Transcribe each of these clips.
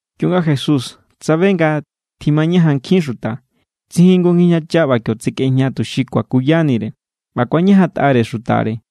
Kionga Jesús tsabe nga tjimañajan nkjin xuta, tsijin jngu ngijñacha ꞌba kio tsekꞌejña tuxi kuakuyanire. ꞌBa kuañajantꞌare xutare.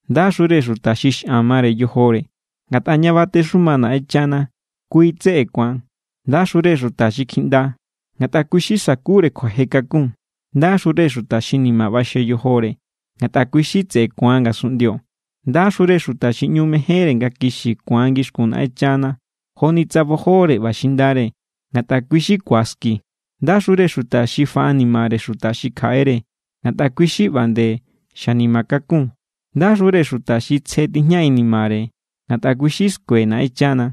—Ndaxure xuta xi xꞌan mare yojore, ngatꞌa ña batexuma Naꞌenchana kui= tseꞌe ku̱an. ’Ndaxure xuta xi kjiꞌnda, ngatꞌa kui= xi sakure kjuaje kakun. ’Ndaxure xuta xi ni̱ma̱ ꞌbaxje yojore, ngatꞌa kui= tseꞌe ku̱an ngasunꞌndio. ’Ndaxure xuta xi ꞌñu mejénre nga kixi ku̱an ngixkun Naꞌenchana joni tsa bojore ꞌba xindare, ngatꞌa kui= xi ku̱aski. ’Ndaxure xuta xi faꞌanimare xuta xi kjaꞌere, ngatꞌa kui= xi ꞌba nde xanima kakun. ’Ndaxure xuta xi tsje tijña inimare, ngatꞌa kui= xi skue Naꞌenchana.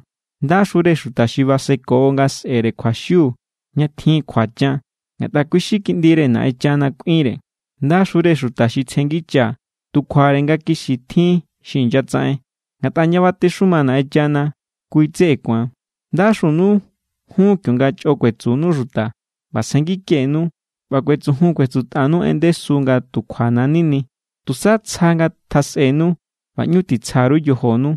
’Ndaxure xuta xi baseko nga sꞌe̱re kjuaxiu ña tjin kjuachan, ngatꞌa kui= xi kiꞌndire Naꞌenchana kꞌuinre. ’Ndaxure xuta xi tsjengicha tu kjuare nga kixi tjin xi inyatsaꞌen, ngatꞌa ña batexuma Naꞌenchana kui= tseꞌe ku̱an. ’Ndaxunu jun kionga chꞌo kuetsunu xuta ꞌba tsjenngikenu ꞌba kuetsujun kuetsutꞌanu en ndesu nga tu kjuana̱= nini. Tusa tsja ngatjasꞌenu ꞌba ꞌñu titsja_ru yojonu,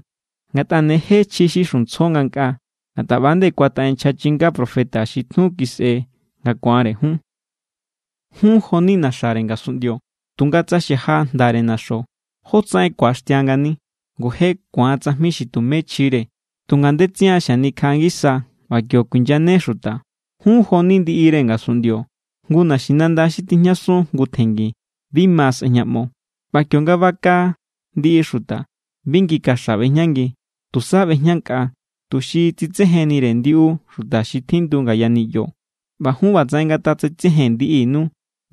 ngatꞌa ne je chji xi xuntsjo ngankꞌaa. Ngatꞌa ꞌba=nde kuataꞌen nchja chinga profeta xi tjun kisꞌe nga ku̱anre jun. ’Jun jo=ni naxare ngasunꞌndio. Tunga tsa xaja jndare naxo, ¿jótsaꞌen ku̱axtia ngani? Ngu je ku̱an tsajmi xi tume chjire. Tu ngandetsian xanikjaꞌa ngisa ꞌba kio kuinyane xuta. ’Jun jo=ni ndiꞌire ngasunꞌndio. Jngu naxinanda xi tijñasun jngu tjengi, bi ma sꞌejñaꞌmo. ꞌBa kionga baka ndiꞌi xuta, bi ngi kaxa ꞌbejñangi. Tusa ꞌbejñankꞌa, tuxi tsitsejennire ndiꞌu xuta xi tjindu ngaya niꞌyo. ꞌBa jun, ꞌba tsaꞌen ngatatsitsejen ndiꞌinu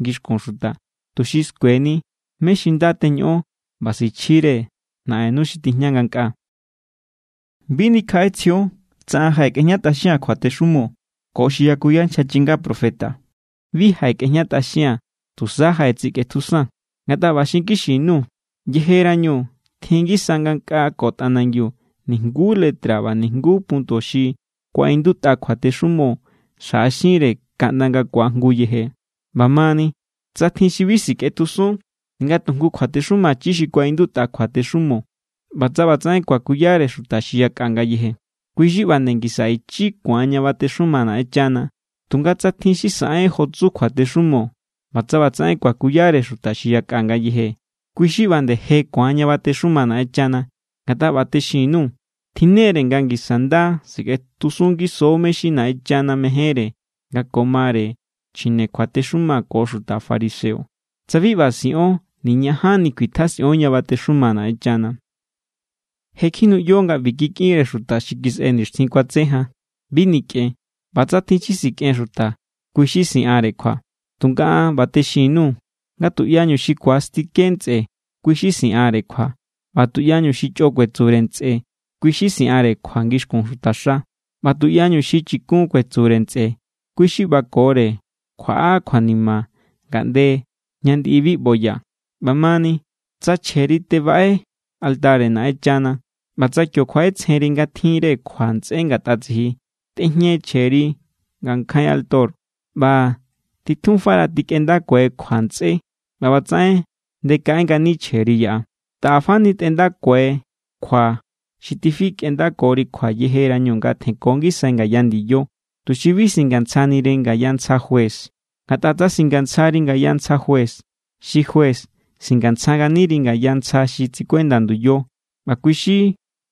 ngixkun xuta, tuxi skueni mé= xi nda teñoꞌon ꞌba sichjire Naꞌennu xi tijña ngankꞌaa. ’Bi nikjaꞌetsjion tsa an jaꞌekꞌejñatꞌaxia̱n kjuatexumo ko xi yakuya nchja chinga profeta. Bi jaꞌekꞌejñatꞌaxia̱n, tusa jaꞌetsikꞌetjusaa̱n. Ngatꞌa ꞌba xinkixi_nuu̱. Yejerañu tjin ngisa ngankꞌaa ko tꞌanangiu nijnguú letra ꞌba nijnguú punto xi kuaꞌindutꞌa kjuatexumo xjaꞌaxinre kaꞌnda nga ku̱ajngu yeje. ꞌBa mani, tsa tjin xi bi sikꞌetjusun ninga tu jngu kjuatexumachi xi kuaꞌindutꞌa kjuatexumo ꞌba tsa ꞌba tsaꞌen kuakuyare xuta xi yakꞌa ngayeje, kui= xi ꞌba nde ngisa ichi ku̱an ña batexuma Naꞌenchana. Tunga tsa tjin xi saꞌen jo tsu kjuatexumo ꞌba tsa ꞌba tsaꞌen kuakuyare xuta xi yakꞌa ngayeje, kui= xi ꞌba nde je ku̱an ña batexuma Naꞌenchana. Ngatꞌa ꞌba texin_nuu̱. Tjinnere nga ngisa nda sikꞌetjusun ngiso mé= xi Naꞌenchana mejénre nga ko mare chjine kjuatexuma ko xuta fariseo. Tsa bi ꞌba siꞌon, niñajanni kjuitjasꞌion ña batexuma Naꞌenchana. ’Je kjinuꞌyo nga ꞌbi kikꞌinre xuta xi kisꞌe nixtjin kuatse jan: “Bi nikꞌen. ꞌBa tsa tjin xi sikꞌen xuta, kui= xi siꞌanre kjua.” Tunga an ꞌba texin_nuu̱ nga tuꞌyañu xi ku̱astike ntsꞌe, kui= xi siꞌanre kjua. ꞌBa tuꞌyañu xi chꞌo kuetsure ntsꞌe, kui= xi siꞌanre kjua ngixkun xutaxa. ꞌBa tuꞌyañu xi “chikun” kuetsure ntsꞌe, kui= xi ꞌbakore kjuaꞌa kjuanima ngaꞌnde ña ndiꞌi bi ꞌboya. ’ꞌBa mani, tsa chjeri tebaꞌe altare Naꞌenchana ꞌba tsa kio kjuaꞌetsjenri nga tjinre kjua ntsꞌé ngatꞌa tsiji, tꞌejñe chjeri ngankjain alto ꞌba titjunfara tikꞌendakuai kjua ntsꞌé. ꞌBa ꞌbatsaꞌen ndekaꞌe ngani chjeri yaꞌa. ’Taꞌa fani tꞌendakuai kjua xi tifikꞌendakori kjua yejerañu nga tjenko ngisai ngaya ndiyo, tuxi bi singantsjaniri ngaya ntsja juez. Ngatꞌa tsa singantsjari ngaya ntsja juez, xi juez singantsja nganiri ngaya ntsja xi tsikuenda nduyo ꞌba kui xi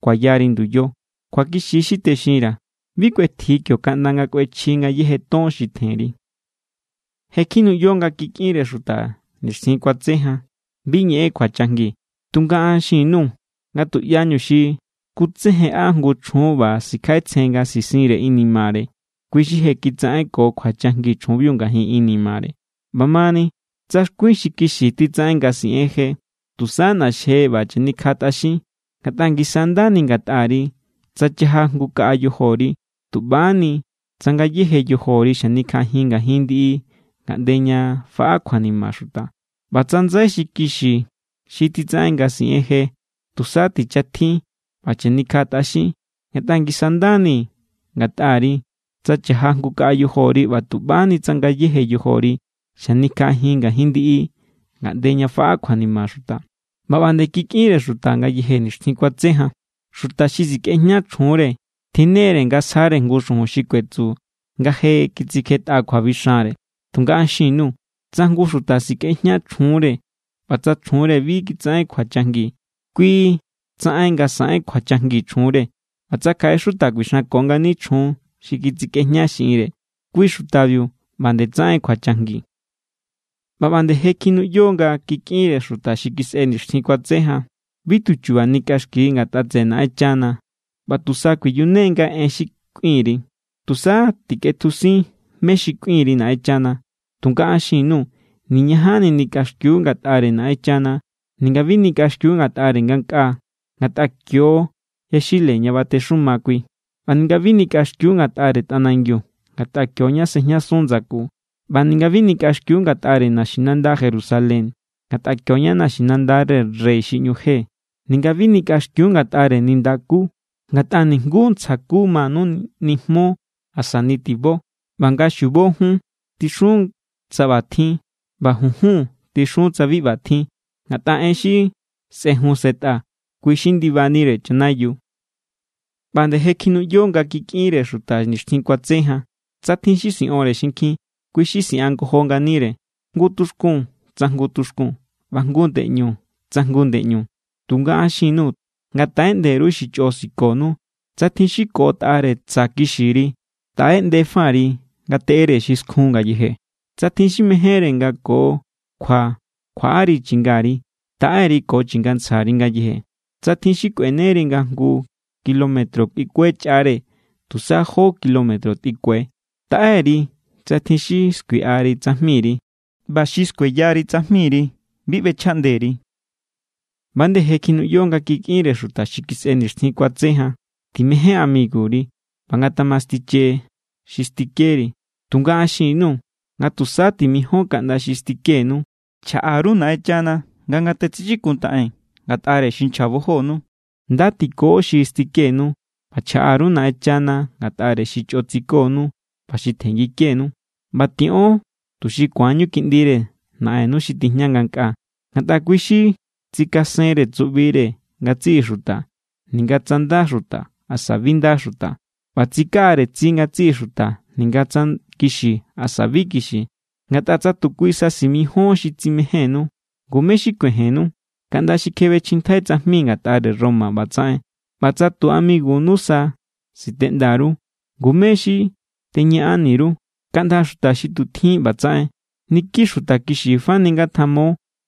kuayari nduyo. Kjuakixi= xi texinra̱. Bi kꞌuetji kio kaꞌnda nga kꞌuechji ngayéje ton xi tjenri. ’Je kjinuꞌyo nga kikꞌinre xuta nixtjin kuatse jan: “Bi ñeꞌen kjuachajngi.” Tunga an xin_nuu̱ nga tuꞌyañu xi skutsejenꞌa jngu chjun ꞌba sikjaꞌetsjen nga sisinre inimare, kui= xi je kitsaꞌenko kjuachajngi chjunbiu ngajin inimare. ’ꞌBa mani tsa xkuin xi kixi xi titsaꞌen nga siꞌen je, tusa ꞌna̱xje ꞌba chanikjaꞌatꞌaxin. Ngatꞌa ngisa= nda ni ngatꞌari tsa chaja jngu kaꞌa yojori, tu ꞌba= ni tsa ngayéje yojori xanikjaꞌajin ngajin ndiꞌi ngaꞌnde ña faꞌa kjuanima xuta. ꞌBa tsa ndsai xi kixi xi titsaꞌen nga siꞌen je, tusa tichatjin ꞌba chanikjaꞌatꞌaxin. Ngatꞌa ngisa= nda ni ngatꞌari tsa cha̱ja jngu kaꞌa yojori, tu ꞌba= ni ni tsa ngayéje yojori xanikjaꞌajin ngajin ndiꞌi ngaꞌnde ña faꞌa kjuanima xuta. ’ꞌBa ꞌba nde kikꞌinre xuta ngayeje nixtjin kuatse jan: “Xuta xi sikꞌejña chjunre tjinnere nga sjare jngu xujun xi kuetsu nga je kitsikjetꞌa kjuabixanre.” Tunga an xin_nuu̱. Tsa jngu xuta sikꞌejña chjunre ꞌba tsa chjunre bi kitsaꞌen kjuachajngi, kui= tsaꞌen nga saꞌen kjuachajngi chjunre. ꞌBa tsa kjaꞌe xuta kuixanko ngani chjun xi kitsikꞌejña xiꞌinre, kui xutabiu ꞌba nde tsaꞌen kjuachajngi. ’ꞌBa ꞌba nde je kjinuꞌyo nga kikꞌinre xuta xi kisꞌe nixtjin kuatse jan: “Bi tu chu̱ba̱ nikꞌaxki ngatꞌa tseꞌe Naꞌenchana ꞌba tusa kuiyunengai en xi kꞌuin_ri. Tusa tikꞌetjusin mé= xi kꞌuin_ri Naꞌenchana.” Tunga an xin_nuu̱ niñajanni nikꞌaxkiu ngatꞌare Naꞌenchana. Ninga bi nikꞌaxkiu ngatꞌare ngankꞌaa, ngatꞌa kio= yaxile ña batexuma kui. ꞌBa ninga bi nikꞌaxkiu ngatꞌare tꞌanangiu, ngatꞌa kio= ña sejñasun ndsaku. ꞌBa ninga bi nikꞌaxkiu ngatꞌare naxinanda Jerusalén, ngatꞌa kio= ña naxinandare Rey xi ꞌñu je. Ninga bi nikꞌaxkiu ngatꞌare nindakú, ngatꞌa nijnguú ntsja ku manu nijmo asa nitibo. ꞌBa nga xiubo, “jun” tixun tsa ꞌba tjin, ꞌba “junjun” tixun tsa bi ꞌba tjin. Ngatꞌa en xi sꞌejun sꞌetꞌa, kui= xi ndibanire chanayiu. ’ꞌBa nde je kjinuꞌyo nga kikꞌinre xuta nixtjin kuatse jan: “Tsa tjin xi siꞌonre xinkjin, kui= xi siꞌanngojo nganire, jngu tuxkun tsa jngu tuxkun ꞌba jngu ndeꞌñu tsa jngu ndeꞌñu.” Tunga an xin_nuu̱ nga taꞌeꞌnde_ru xi chꞌo sikonu. Tsa tjin xi koꞌotꞌare tsa̱ kixiri, taꞌeꞌndefa_ri ngateꞌere xi skjun ngayeje. Tsa tjin xi mejénre nga ko kjua kjuaꞌari chingari, taꞌe_ri ko chingantsjari ngayeje. Tsa tjin xi kꞌueneri nga jngu kilómetro kꞌuikue chꞌare, tusa jó kilómetro tꞌikue. Taꞌe_ri tsa tjin xi skuiꞌari tsajmiri, ꞌba xi skueyari tsajmiri, bi ꞌbechjaꞌnde_ri. ’ꞌBa=nde je kjinuꞌyo nga kikꞌinre xuta xi kisꞌe nixtjin kuatse jan: “Timején amiguri, ꞌba ngatamastiche xi stikeri.” Tunga an xin_nuu̱ nga tusa timijon kaꞌnda xi stikenu. Chjaꞌa_ru Naꞌenchana nga ngatatsichikuntaꞌen ngatꞌare xi nchjabojonu, nda tiko xi stikenu, ꞌba chjaꞌa_ru Naꞌenchana ngatꞌare xi chꞌo tsikonu ꞌba xi tjenngikenu. ꞌBa tiꞌon tuxi ku̱anñu kiꞌndire Naꞌennu xi tijña ngankꞌaa. Ngatꞌa kui= xi tsikasenre tsuꞌbire ngatsiꞌi xuta ninga tsa nda xuta asa bi nda xuta. ꞌBa tsikaꞌare tsi ngatsiꞌi xuta ninga tsa kixi asa bi kixi. Ngatꞌa tsa tu kui sa simijíon xi tsimejénnu, ¿ngu mé= xi kuejennu? Kaꞌnda xi kjebechjintjai tsajmi ngatꞌare Roma ꞌba tsaꞌen. ꞌBa tsa tu amigunu sa siteꞌnda_ru, ¿ngu mé= xi teñaꞌani_ru? Kaꞌnda xuta xi tu tjin ꞌba tsaꞌen. Niki xuta kixi fani ngatjamo,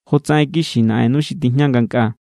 jotsaꞌen kixi Naꞌennu xi tijña ngankꞌaa.